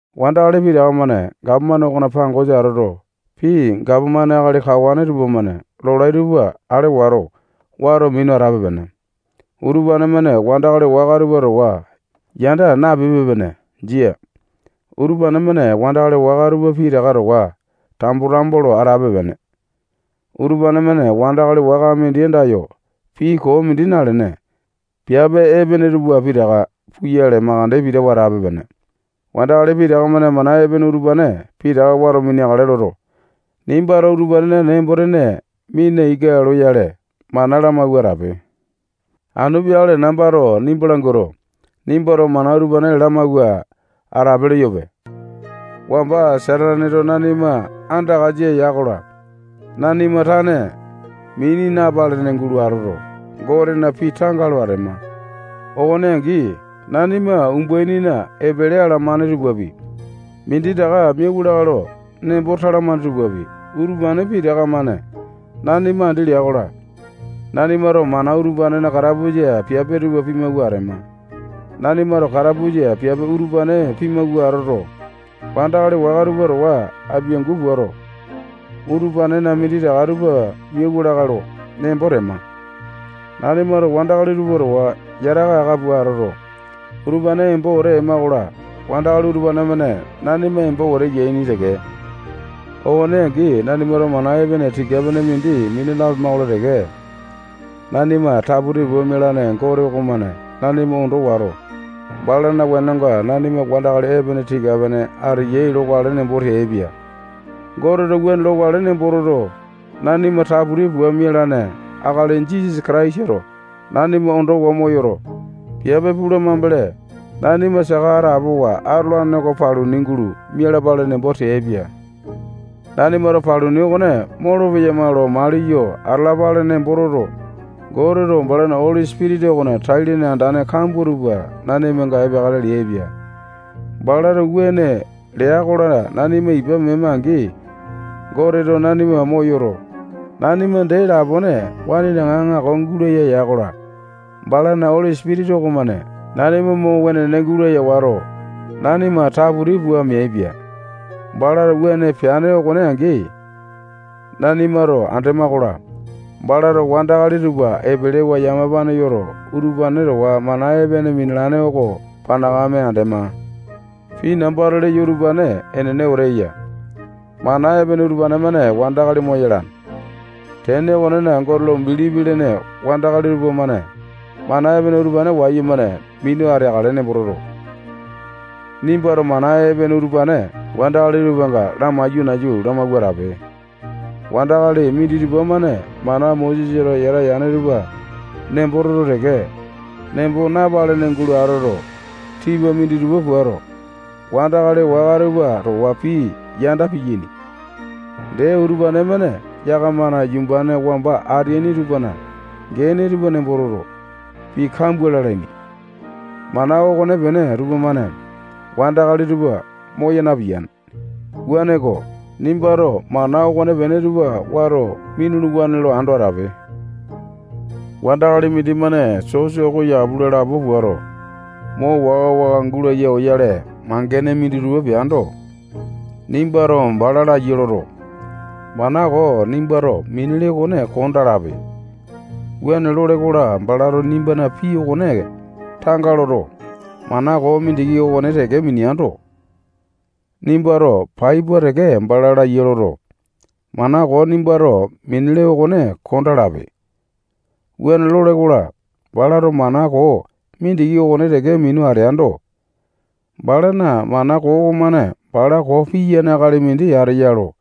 Wandakali pitaka-mane gapomane okona pangosa atoto, pii gapomane akali kawane tupamane lolai tupa alewa wato, wato minu atape-pene. Utupane-mane wandakali waka tupa towa yanda napipe-pene. Jia. Utupane-mane wandakali waka tupa pitaka towa tambo-tambo lo atape-pene. Utupane-mane wandakali waka mindi andayo pii koo mindi nalene, piape epene tupa pitaka puyale makande pitawa atape-pene. Wandakali pitaka-mane mana epene utupane pitaka wato mineakale loto, nimbato utupanena nembo-tene mina ika loyale, mana lamawua atape. Anu peakale nambato nimba languato, nimbato mana utupane lamawua atape leyope. Wamba Sataneto nanima andakasa ya-kola, nanima tane mini napalene gulo atoto, Gotena pii tanga lo atema. Okone angi, nanima umbainina epele alamane tupapi, minditaka miauwa lakae lo nembo talamane tupapi, utupane pitaka-mane nanima andi lea-kola, nanimato mana utupanena katapusa piape tupa pimawua atema. Nanimato katapusa piape utupane pimawua atoto, wandakali waka tupa towa apiangu puato, utupanena minditaka tupa miauwa lakae lo nembo tema. Nanimato wandakali tupa towa yataka aka pua atoto, utupane embo wete ema-kola, wandakali utupane-mane nanima embo wete yaini teke. Okone angi, nanimato mana epene tika-pene mindi mina napema-kola teke, nanima taputi pua mialane Gote okomane nanima ondo wato, balana wenonga nanima wandakali epene tika-pene ateyai lokale nembo teaipia. Goteto wuane lokale nembo toto, nanima taputi pua mialane akali Jisasa Kataisato nanima ondowa moyoto, piape pula mambele, nanima saka atapowa atolane oko paluni gulo mialapale nembo teaipia. Nanimato paluni okone molopeyama lo maliyo atalapale nembo toto, Goteto balana Oli Sipitisa okona tai-lene andane kambua tupa nanimanga epeakale leaipia. Balato wuane lea-kola, nanima ipa mema-angi, Goteto nanima moyoto, nanima dee lapone waninaŋa aŋako gulaya ya-kola, balana Oli Sipitisa okomane nanima mo wenene gulaya wato, nanima taputi pua meaipia. Balato wuane peane okone angi, nanimato andema-kola, balato wandakali tupa epelewa yamapane yoto, utupane towa mana epene minalane oko panakame andema. Pii nambato leyo utupane enene wete eya. Mana epene utupane-mane wandakali moyalane. Tene okonena, Gote lo bilipi lene wandakali tupamane mana epene utupane wayumane minu ateakale nembo toto, nimbato mana epene utupane wandakali tupanga lamaiyo nayu lamawua atape. Wandakali minditupa-mane mana Mosesato yata yane tupa nembo toto teke, nembo napalene gulo atoto, tipa minditupa puato, wandakali waka tupa towa pii yanda piyaini. Dee, utupane-mane yakamana yumbane wamba ateaini tupana gene tupa nembo toto, pii kambua lalaini. Mana okonepene tupamane wandakali tupa moya piyane. Wuaneko, nimbato mana okonepene tupa wato minuluwane lo ando atape. Wandakali mindimane sosa oko yapu lo lapo puato, mo waka-waka gulaya oyale mangene minditupa peando, nimbato bala laiya loto, mana koo nimbato minele okone kondaa lape. Wuane lole-kola, balato nimbana pii okone tanga loto, mana koo mindiki okone teke mineando, nimbato pai pua teke bala laiya loto, mana koo nimbato minele okone kondaa lape. Wuane lole-kola, balato mana koo mindiki okone teke minu ateando, balana mana koo okomane bala koo piyane akali mindi ateya lo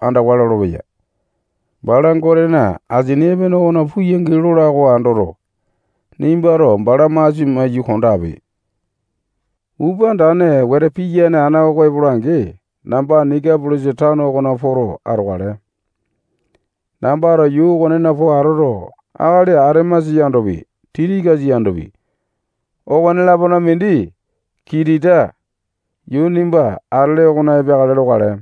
andawa lolopeya. Bala Gotena asini epene oko puyangi lola oko andoto, nimbato bala masia maiyu kondape. Upa andane wete piyane ana oko epola-angi, namba Nikapolisa tano okona poto atokale. Nambato yuu okonena po atoto, akali Atemasa yandopi, Tikikasa yandopi, okone-lapona mindi Kitita yuu nimba atele okona epeakale lokale.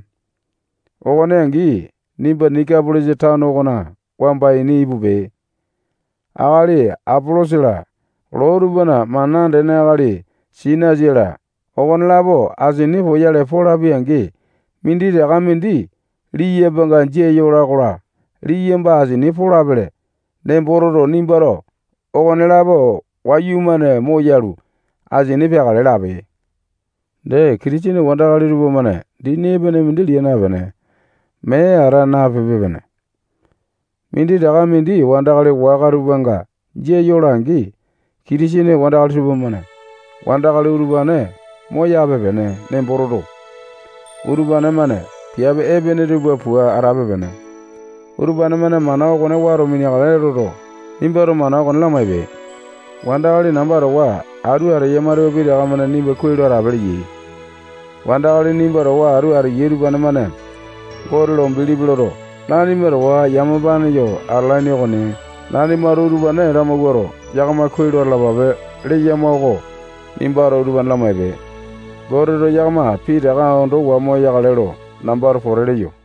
Okone angi, nimba Nikapolisa tano okona wamba ini ipupe. Akali Apolosa-la, loo tupana mana andene akali Sinasa-la, okonelapo asini poyale polapi-angi, minditaka mindi liyambanga jia yola-kola, liyamba asini polapele nembo toto, nimbato okonelapo wayumane moyalu, asini peakale lape. Dee, Kitisene wandakali tupamane dini epene mindi lia napene, mee ata napipe-pene. Minditaka mindi wandakali waka tupanga jia yola-angi, Kitisene wandakali tupamane wandakali utupane moyape-pene nembo toto, utupane-mane piape epene tupa pua atape-pene. Utupane-mane mana okone wato mineakale loto, nimbato mana okone lamaipe. Wandakali namba towa atu ateyama tupa pitaka-mane nimba kuai lo atape leyai. Wandakali nimba towa atu ateyai tupamane Gote lo bilipi loto, nanima towa yamapane yo atalaini okoni. Nanimato utupane lamawuato, yakama kuai lo atalapape leyama oko nimbato utupane lamaipe. Goteto yakama pitaka ondowa moyakale lo nambato pote leyo.